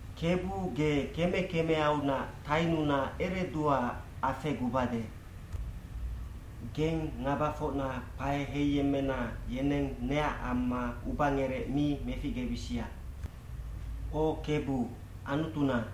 Kebu ge keme kemeaunac tainuna ereduaac afegubade. Geng ngabafocna kpae heiyemmena yeneng neac amma ubangerec mi meficgebisia. O Kebu, Anutuna,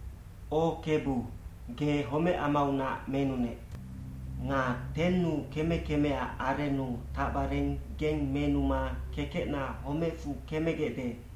O Kebu, ge homecamaunac menunec. Nga tennu keme kemeac arennu tacbareng geng menuma kekecna homecfu kemegecde,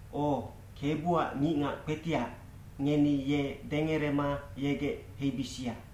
O, Kebuac ngicngac kpetiac, ngeni ye dengerema yegec heibisia.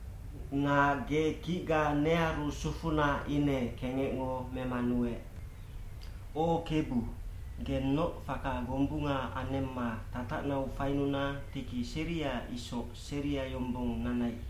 Nga ge kicga nearu sufuna ine kengecngo memanuec. O Kebu, gennoc faka gombunga anemma tatacnau fainuna tiki seria isoc seria yombong nanai.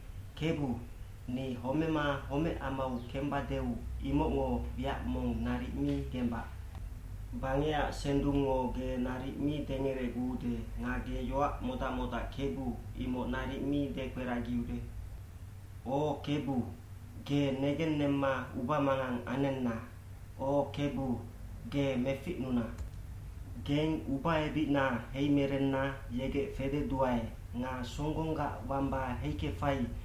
Kebu, ni homema homecamau kemebadeu imocngo wiac mong naric mi gembac. Bangecac sendungngo ge naric mi dengereguude nga ge yoac modac modac Kebu, imoc naric mi dekperagiude. O Kebu, geng negennemma ubamangang anenna, o Kebu, ge meficnuna.” Geng ubaebicna heimerenna yegec fededuae nga songgonggac wamba heikefai,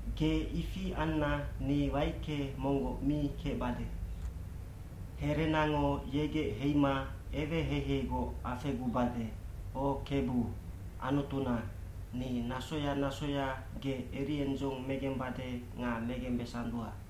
Ge ifi anna ni waicke monggoc mi kecbade. Herenango yegec heima eweheiheigoc afegubade, o Kebu, Anutuna, ni nasoya nasoya ge eriendzong megembade nga megembesandua.